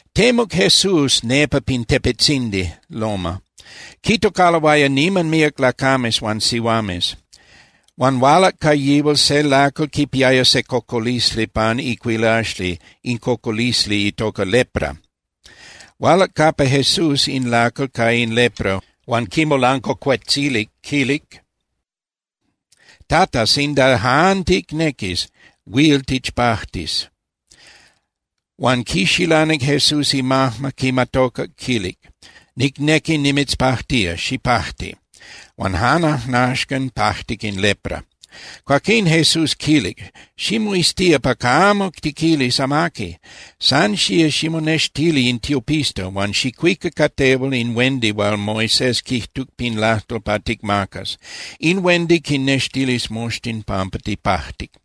Temuc Jesús nepa pin tepetzindi (loma), quitocaloaya niman míac lacames huan sihuames. Huan hualac ca yihual se lacal quipiaya se cocolisli pan icuilaxli, in cocolisli itoca lepra. Hualac capa Jesús in lacal ca in lepra huan quimolancuacuetzilic, quilic: —Tata, sinda jan ticnequis, huil tichpajtis. Huan quixilanic Jesús imajma, quimatocac, quilic: —Nicnequi nimitzpajtía, xipajti. Huan jan ajnaxcan pajtic in lepra. Cuaquín Jesús quilic: —Ximoiztía pa camo tiquilis amaqui. San xía ximonextili in tiopista, huan xicuica ca tehual in huendi hual Moisés quijtuc pin lajtol pa ticmacas. In huendi quinnextilis moxtin pampa tipajtic.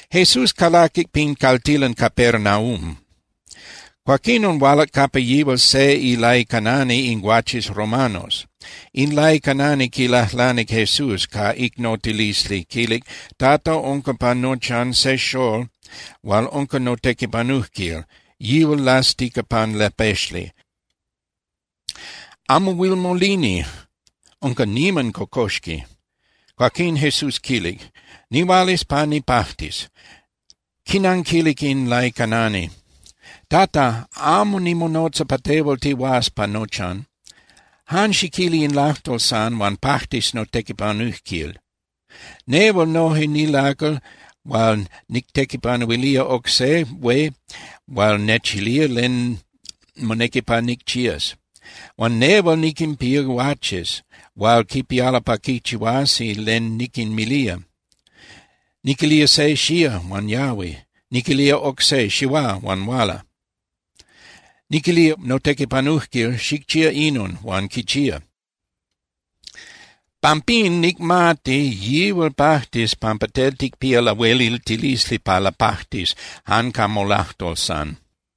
Jesús calaquic pin caltilan Capernaum. Cuaquinon hualac capa yihual se ilaicanani in guaches romanos. In laicanani quilajlanic Jesús ca icnotilisli, quilic: —Tata, unca pa nochan se xól hual unca notequipanujquil, yihual lastica pan lapexli. Amo huil molini, unca niman cocoxqui. Cuaquín Jesús quilic: —Nihualas pa nicpajtis. Quinanquilic in laicanani: —Tata, amo nimonotza pa tehual tihuás pa nochan. Jan xiquili in lajtol san, huan pajtis notequipanujquil. Nehual noje nilacal hual nictequipanuilía oc se hué hual nechilía len monequi pa nicchías. Huan nehual niquinpía guaches hual quipialo pa quichihuasi len niquinmilía. Niquilía se: “Xía”, huan yahui. Niquilía oc se: “Xihuá”, huan huala. Niquilía notequipanujquil: “Xicchía inon”, huan quichía. Pampín nicmati yihual pajtis pampa tel ticpía lahueliltilisli pa lapajtis jan ca molajtol san.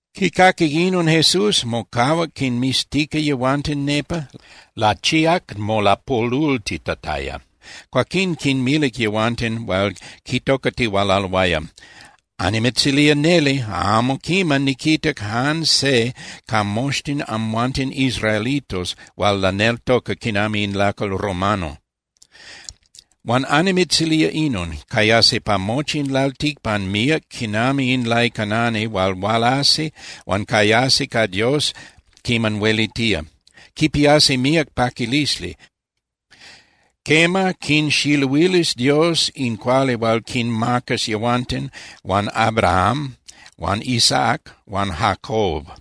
Quicaquic inon Jesús, mocahuac quinmiztica yehuanten nepa, lachíac molapolultitataya, cuaquín quinmilic yehuanten hual quitocatihualaloaya: —Annimitzilía neli, amo quiman niquitac jan se ca moxtin amhuanten israelitos hual laneltoca quinami in lacal romano. Huan annimitzilía inon: Cayasi pa mochi in lalticpan míac quinami in laicanani hual hualasi huan cayasi ca Dios quiman huelitía. Quipiasi míac paquilisli. Quema, quinxiluilis Dios in cuali hual quinmacas yehuanten huan Abraham huan Isaac huan Jacob.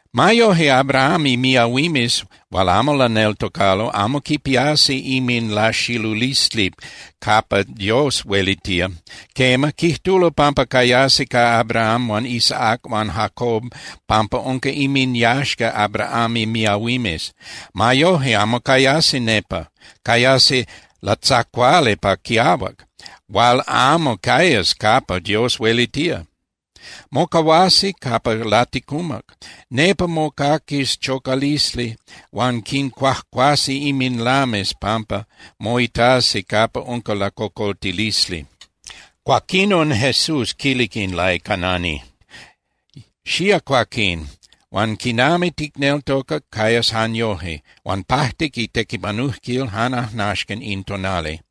Ma yoje, Abraham imiahuimes hual amo laneltocalo amo quipiasi inminlaxilulisli capa Dios huelitía. Quema, quijtulo pampa cayasi ca Abraham huan Isaac huan Jacob pampa unca inminyaxca Abraham imiahuimes. Ma yoje, amo cayasi nepa. Cayasi latzacuali pa quiahuac, hual amo cayas capa Dios huelitía. Mocahuasi capa laticumac. Nepa mocaquis chocalisli huan quincuajcuasi inminlames pampa moitasi capa unca lacocoltilisli. Cuaquinon Jesús quilic in laicanani: —Xía cuaquín. Huan quinami ticneltocac, cayas jan yoje. Huan pajtic itequipanujquil jan ajnaxcan in tonali.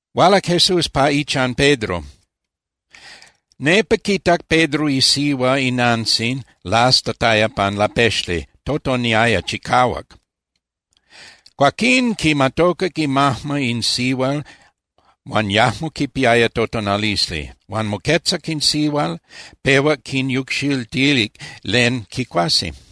Hualac Jesús pa ichan Pedro. Nepa quitac Pedro isihua inantzin lastataya pan lapexli, totoniaya chicahuac. Cuaquín quimatocac imajma in sihual huan yajmo quipiaya totonalisli. Huan moquetzac in sihual, pehuac quinyucxiltilic len quicuasi.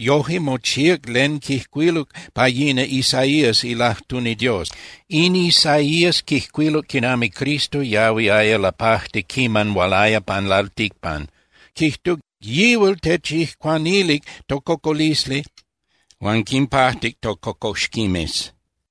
Yojque mochíac len quijcuiluc pa yina Isaías ilajtuni Dios. In Isaías quijcuiluc quinami Cristo yahuiaya lapajti quiman hualaya pan lalticpan, quijtuc: “Yihual techijcuanilic tococolisli huan quinpajtic tococoxquimes.”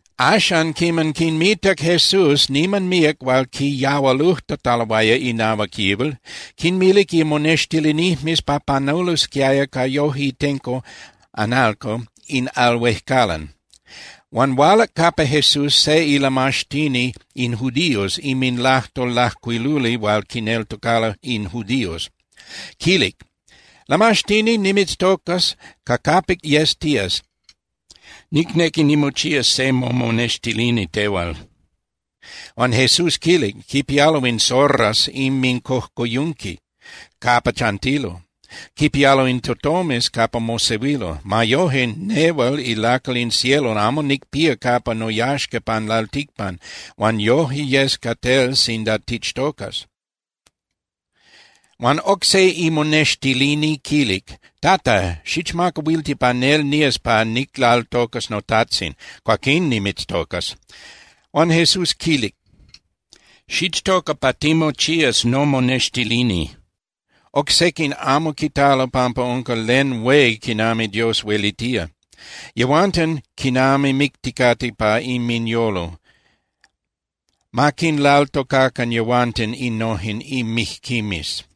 Axan quiman quinmitac Jesús niman míac hual quiyahualujtataloaya inahuac yihual, quinmilic imonextilinijmes pa panulosquiaya ca yoje itenco (analco) in al huejcalan. Huan hualac capa Jesús se ilamaxtini in judíos inminlajtol lajcuiluli hual quineltocalo in judíos. Quilic: —Lamaxtini, nimitztocas ca capic yes tías, nicnequi nimochías se momonextilini tehual. Huan Jesús quilic: —Quipialo in zorras inmincojcoyunqui capa chantilo. Quipialo in tutomes capa mosehuilo. Ma yoje, nehual ilacal in cielo amo nicpía capa noyaxca pan lalticpan, huan yoje yes ca tel sinda tichtocas. Huan oc se imonextilini quilic: —Tata, xichmacahuilti pa nel nías pa niclaltocas notajtzin. Cuaquín nimitztocas. Huan Jesús quilic: —Xichtoca pa timochías nomonextilini. Oc sequin amo quitalo pampa unca len hué quinami Dios huelitía. Yehuanten quinami micticate pa inminyolo. Ma quinlaltocacan yehuanten innojen mijquimes.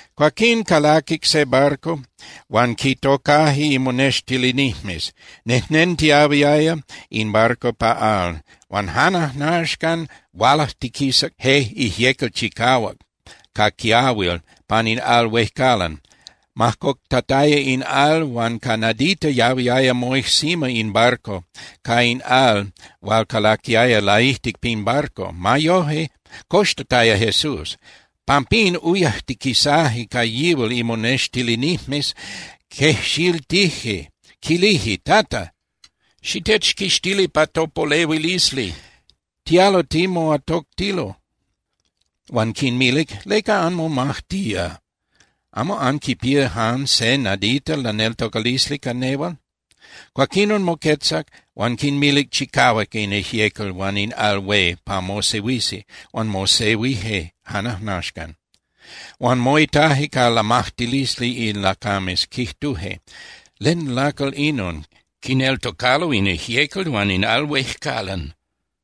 Cuaquín calaquic se barco huan quitocaje imonextilinijmes. Nejnentiyahuiaya in barco pa al, huan jan ajnaxcan hualajtiquisac je ijyecal chicahuac ca quiahuil pan in al huejcalan. Majcoctataya in al huan ca nadita yahuiaya moijsima in barco ca in al hual calaquiaya laijtic pin barco. Ma yoje, coxtataya Jesús. Pampín uyajtiquisaje ca yihual imonextilinijmes, quejxiltije, quilije: —¡Tata! ¡Xitechquixtili pa topolehuilisli! ¡Tialo timoatoctilo! Huan quinmilic: —¿Leca anmomajtía? ¿Amo anquipía san se nadita laneltocalisli ca nehual? Cuaquinon moquetzac huan quinmilic chicahuac in ijyecal huan in al hué pa mosehuisi huan mosehuije jan ajnaxcan. Huan moitaje ca lamajtilisli in lacames, quijtuje: —¿Len lacal inon? ¡Quineltocalo in ijyecal huan in al huejcalan!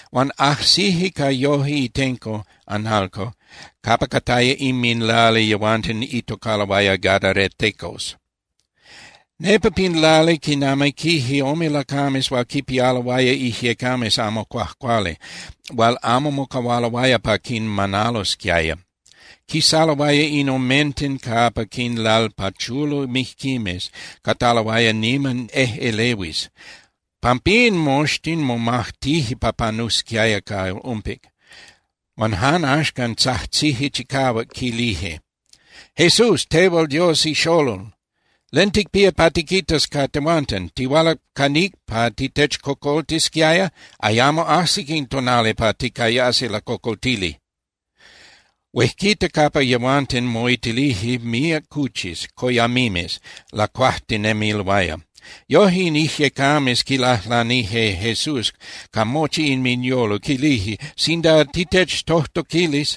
Huan ajsije ca yoje itenco (analco) capa cataya inminlali yehuanten itocaloaya gadaratecos. Nepa pin lali quinamiquije ome lacames hual quinpialoaya ijyecames amo cuajcuali hual amo mocahualoaya pa quinmanalosquiaya. Quisaloaya in omenten capa quinlalpachulo mijquimes, cataloaya niman ejꞌelehuis. Pampín moxtin momajtije pa panusquiaya ca umpic. Huan jan axcan tzajtzije chicahuac, quilije: —¡Jesús, tehual Dios ixolol! ¿Len ticpía pa tiquitas ca tehuanten? ¿Tihualac ca níc pa titechcocoltisquiaya? ¡Ayamo ajsic in tonali pa ticayasi lacocoltili! Huejquita capa yehuanten moitilije míac cuchis (coyamimes) lacuajtinemiloaya. Yoje in ijyecames quilajlanije Jesús ca mochi inminyolo, quilije: —Sinda titechtojtoquilis,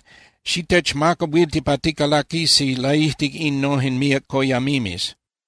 xitechmacahuilti pa ticalaquisi laijtic innojen míac coyamimes.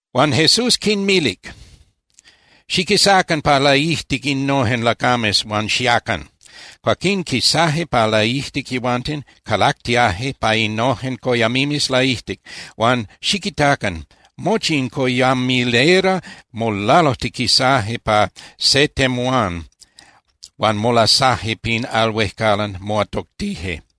Huan Jesús quinmilic: —Xiquisacan pa laijtic innojen lacames huan xiacan. Cuaquín quisaje pa laijtic yehuanten, calactiaje pa innojen coyamimes laijtic. Huan ¡xiquitacan! Mochi in coyamilera molalujtiquisaje pa se temuán (temuayan) huan molasaje pin al huejcalan, moatoctije.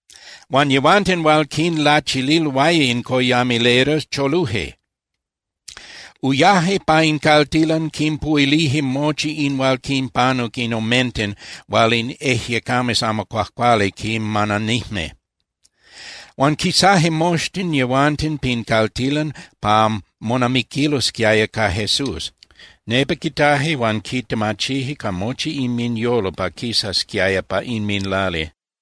Huan yehuanten hual quinlachililoaya in coyamilera choluje. Uyaje pa in caltilan, quinpuhuilije mochi in hual quinpanuc in omenten hual in ijyecames amo cuajcuali quinmananijme. Huan quisaje moxtin yehuanten pin caltilan pa monamiquilosquiaya ca Jesús. Nepa quitaje huan quitemachije ca mochi inminyolo pa quisasquiaya pa inminlali.